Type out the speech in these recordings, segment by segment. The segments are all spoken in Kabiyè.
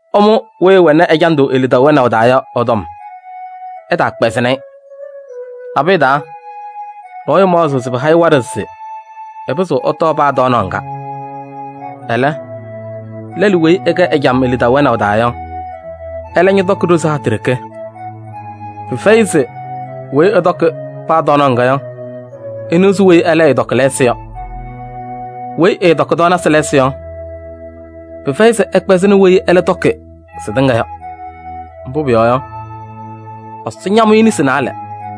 Ɩmʋ weyi ɛwɛnɩ ɛjandʋ e-lidaʋ wɛnaʋ taa yɔ ɛ-tɔm, ɩtaakpɛzɩnɩ-ɩ. Nabʋyʋ taa, nɔɔyʋ maɣzɩɣ se pɩha-ɩ waɖɛ se ɛpɩzɩɣ ɛtɔɔ paa tɔɔnaɣ ŋga. Ɛlɛ, lɛlʋ weyi ɛkɛ ɛjam e-lidaʋ wɛnaʋ taa yɔ, ɛlɛ ñɔtɔkɩ ɖozi hatʋ ɖeke. Pɩfɛyɩ se weyi ɛtɔkɩ paa tɔɔnaɣ ŋga yɔ, eniɣzi weyi ɛlɛ ɛɛtɔkɩ lɛɛsɩ yɔ. Weyi ɛɛtɔkɩ tɔɔnasɩ lɛɛsɩ yɔ, pɩfɛyɩ se ɛkpɛzɩnɩ weyi ɛlɛ tɔkɩ sɩtɩŋa yɔ. Mbʋ pʋyɔɔ yɔ, Ɛsɔ ñamʋ-ɩ nesi naalɛ.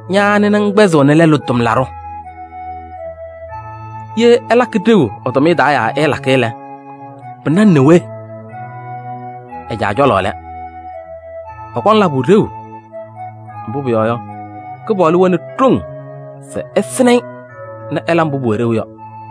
Ña anɩ nɛ ŋkpɛzɩɣnɩ lɛlʋ tʋmlaɖʋ? Ye ɛlakɩ ɖeu ɛ-tʋmɩyɛ taa yaa ɛɛlakɩ lɛ, pɩna-ŋ nɛ we? Ɛ-caa cɔlɔ lɛ. Ɛkɔŋ labʋ ɖeu, mbʋ pʋyɔɔ yɔ, Kɩpaɣlʋ wɛnɩ ɖoŋ se ɛsɩnɩ-ɩ nɛ ɛla mbʋ pʋwɛ ɖeu yɔ.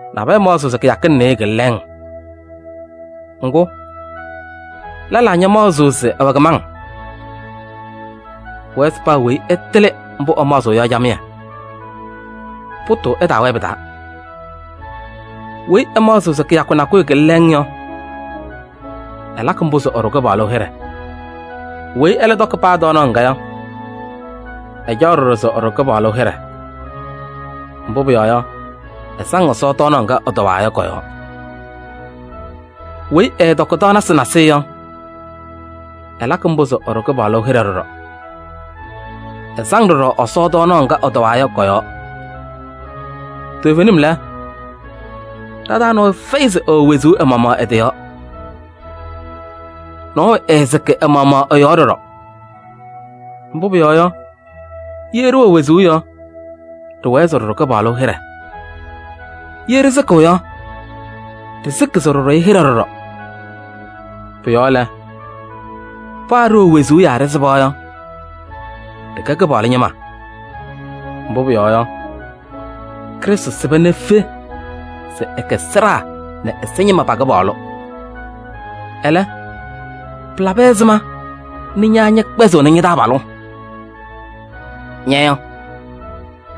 Nabɛyɛ maɣzɩɣ se kɩyakɩŋ nɩɩyɩ kɩlɩ lɛɛŋ. Ŋgʋ, lɛlaa ñamaɣzɩɣ se ɛwɛ kɩmaŋ. Pʋwɛɛ se paa weyi ɛtɩlɩ mbʋ ɛmaɣzɩɣ yɔ camɩyɛ, pʋtʋʋ ɛtaawɛɛ pɩ-taa. Weyi ɛmaɣzɩɣ se kɩyakʋ nakʋyʋ kɩlɩ lɛɛŋ yɔ, ɛlakɩ mbʋ se ɛɖʋ Kɩpaɣlʋ hɩɖɛ. Weyi ɛlɛ tɔkɩ paa tɔɔnaɣ ŋga yɔ, ɛcaɣ ɖɔɖɔ se ɛɖʋ Kɩpaɣlʋ hɩɖɛ. Mbʋ pʋyɔɔ yɔ, ɛsaŋ Ɛsɔ tɔɔnaɣ ŋga ɛtɔwaa yɔ kɔ-yɔɔ. Weyi ɛɛtɔkɩ tɔɔnasɩ nasɩyɩ yɔ, ɛlakɩ mbʋ se ɛɖʋ Kɩpaɣlʋ hɩɖɛ ɖɔɖɔ. Ɛsaŋ ɖɔɖɔ Ɛsɔ tɔɔnaɣ ŋga ɛtɔwaa yɔ kɔ-yɔɔ. Toovenim lɛ, ɖa-taa nɔɔyʋ fɛyɩ se ɛwɛ wezuu ɛ-maɣmaɣ ɛ-yɔɔ. Nɔɔyʋ ɛɛsɩkɩ ɛ-maɣmaɣ ɛ-yɔɔ ɖɔɖɔ. Mbʋ pʋyɔɔ yɔ, ye ɖɩwɛ wezuu yɔ, ɖɩwɛɛ se ɖɩɖʋ Kɩpaɣlʋ hɩɖɛ. Ye ɖɩsɩkɩ yɔ, ɖɩsɩkɩ se ɖɩɖʋ-ɩ hɩɖɛ ɖɔɖɔ. Pʋ-yɔɔ lɛ, paa ɖɩwɛ wezuu yaa ɖɩsɩba yɔ, ɖɩkɛ Kɩpaɣlʋ ñɩma. Mbʋ pʋyɔɔ yɔ, Krɩstʋ sɩba nɛ efe se ɛkɛ sɩɖaa nɛ ɛza ñɩma pa-Kɩpaɣlʋ. Ɛlɛ, pɩlabɩ ɛzɩma nɛ ña ñɛkpɛzɩɣnɩ ña-taabalʋ? Ña yɔ,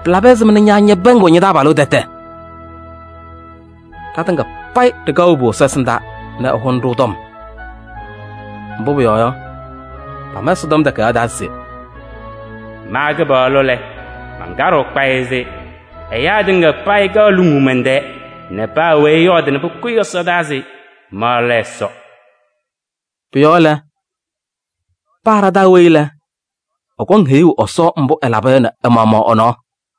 pɩlabɩ ɛzɩma nɛ ñɛpɛɛŋɩɣ ña-taabalʋ tɛtɛ? Ɖatɩŋa payɩ ɖɩkaɣ wobu Ɛsɔ ɛsɩndaa nɛ ɛhʋnɩ-ɖʋ tɔm. Mbʋ pʋyɔɔ yɔ, pama Ɛsɔtɔm Takayaɣ taa se: “Ma Kɩpaɣlʋ lɛ, mankaɖɩɣ kpayɩ se: ɛyaa tɩŋa payɩ kaɣ luŋuu mɛn-tɛɛ nɛ paa weyi ɛyɔɔdɩ nɛ pʋkʋyɩ ɛsɔdaa se ma lɛ Ɛsɔ.” Pʋ-yɔɔ lɛ, paa ɖa-taa weyi lɛ, ɛkɔŋ heyuu Ɛsɔ mbʋ ɛlaba yɔ nɛ ɛ-maɣmaɣ ɛ-nɔɔ.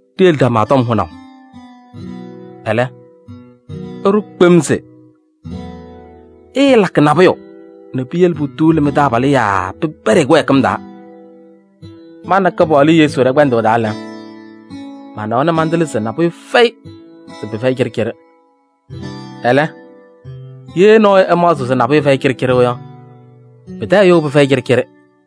Ɖiyele ɖama tɔm hʋnaʋ. Ɛlɛ, ɩɖʋ kpem se: ɩɩlakɩ nabʋyʋ nɛ piyele putuuli mɩ-taabalʋ yaa pɩpɛɖɩ-ɩ kɩwɛɛkɩm taa. Ma nɛ Kɩpaɣlʋ Yesu ɖɛ-kpɛndʋʋ taa lɛ, manawa nɛ mantɩlɩ se nabʋyʋ fɛyɩ se pɩfɛyɩ cɩɖɩcɩɖɩ. Ɛlɛ, ye nɔɔyʋ ɛmaɣzɩɣ se nabʋyʋ fɛyɩ cɩɖɩcɩɖɩ yɔ, pɩtɛ ɛyʋ pɩfɛyɩ cɩɖɩcɩɖɩ.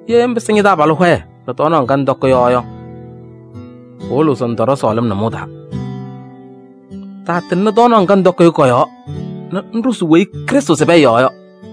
Ye ŋpɩsɩ ña-taabalʋ hɔyɛ nɛ tɔɔnaɣ ŋga ŋtɔkɩ yɔ yɔ, pɩwɩlɩɣ se ŋtɔɖɔ sɔɔlɩm nʋmɔʋ taa. Taatɩŋnɩ tɔɔnaɣ ŋga ŋtɔkɩ yɔ kɔ-yɔɔ nɛ ŋɖʋzɩ weyi Krɩstʋ sɩbɩ ɛ-yɔɔ yɔ.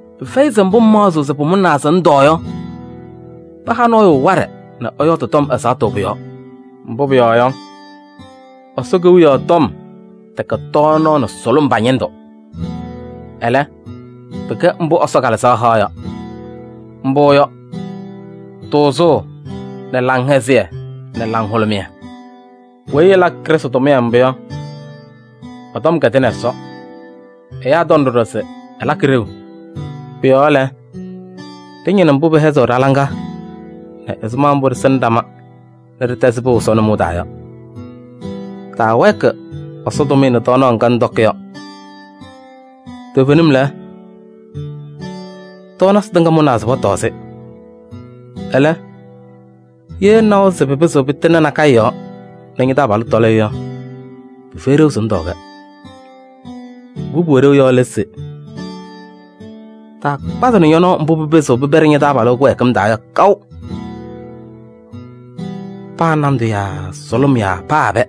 Pɩfɛyɩ se mbʋ ŋmaɣzɩɣ se pʋmʋnaa se ŋtɔɔ yɔ, pɩha nɔɔyʋ waɖɛ nɛ ɛyɔɔdɩ tɔm ɛzaɣtʋ pʋ-yɔɔ. Mbʋ pʋyɔɔ yɔ, Ɛsɔ Kewiyaɣ tɔm tɛkɛ tɔɔnaɣ nɛ sʋlʋm pa-ñɩndʋ. Ɛlɛ, pɩkɛ mbʋ Ɛsɔ Kalɩzaɣ haɣ yɔ. Mbʋ yɔ: tʋʋzʋʋ nɛ laŋhɛzɩyɛ nɛ laŋhʋlʋmɩyɛ. Weyi ɛlakɩ Krɩstʋ tʋmɩyɛ mbʋ yɔ, ɛ-tɔm kɛdɩnɩ Ɛsɔ. Ɛyaa tɔŋ ɖɔɖɔ se ɛlakɩ ɖeu. Pʋ-yɔɔ lɛ, ɖɩñɩnɩ mbʋ pɩhɛzɩɣ ɖa-laŋa nɛ ɛzɩma mbʋ ɖɩsɩnɩ ɖama nɛ ɖɩtɛzɩ pɩʋ Ɛsɔ nʋmɔʋ taa yɔ. Taawɛɛkɩ Ɛsɔ tʋmɩyɛ tɔɔnaɣ ŋga ŋtɔkɩ yɔ kɔ-yɔɔ. Toovenim lɛ, tɔɔnasɩ tɩŋa mʋnaa se pɔtɔɔ-sɩ. Ɛlɛ, ye ŋnawa se pɩpɩzɩɣ pɩtɩŋnɩ nakɛyɛ yɔɔ nɛ ña-taabalʋ tɔlɩ yɔ, pɩfɛyɩ ɖeu se ŋtɔɔ-kɛ. Mbʋ pʋwɛ ɖeu yɔ lɛ se: taakpazɩnɩ ñɔ-nɔɔ mbʋ pɩpɩzɩɣ pɩpɛɖɩ ña-taabalʋ kɩwɛɛkɩm taa yɔ kaʋ. Paa nandʋ yaa sʋlʋm yaa paa ɛbɛ.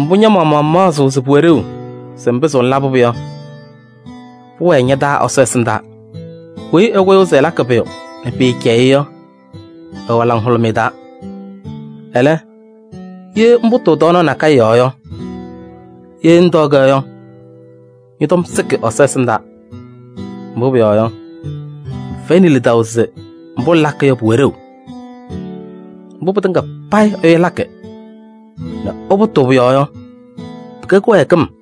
Mbʋ ña-maɣmaɣ ŋmaɣzɩɣ se pʋwɛ ɖeu se ŋpɩzɩɣ ŋlabɩ-pʋ yɔ, pʋwɛɛ ña-taa Ɛsɔ ɛsɩndaa. Weyi ɛkʋyʋʋ se ɛlakɩ pʋyʋ nɛ pɩɩcɛyɩɣ-ɩ yɔ, ɛwɛ laŋhʋlʋmɩyɛ taa. Ɛlɛ, weyi ɛpʋtʋʋ tɔɔnaɣ nakɛyɛ yɔɔ yɔ, ye ɛtɔɔ-kɛ yɔ, ɛ-tɔm sɩkɩ Ɛsɔ ɛsɩndaa. Mbʋ pʋyɔɔ yɔ, ɛfɛyɩnɩ lidaʋ se mbʋ ɛlakɩ yɔ pʋwɛ ɖeu. Mbʋ pɩtɩŋa payɩ ɛyʋ lakɩ nɛ ɛpʋtʋʋ pʋ-yɔɔ yɔ, pɩkɛ kɩwɛɛkɩm.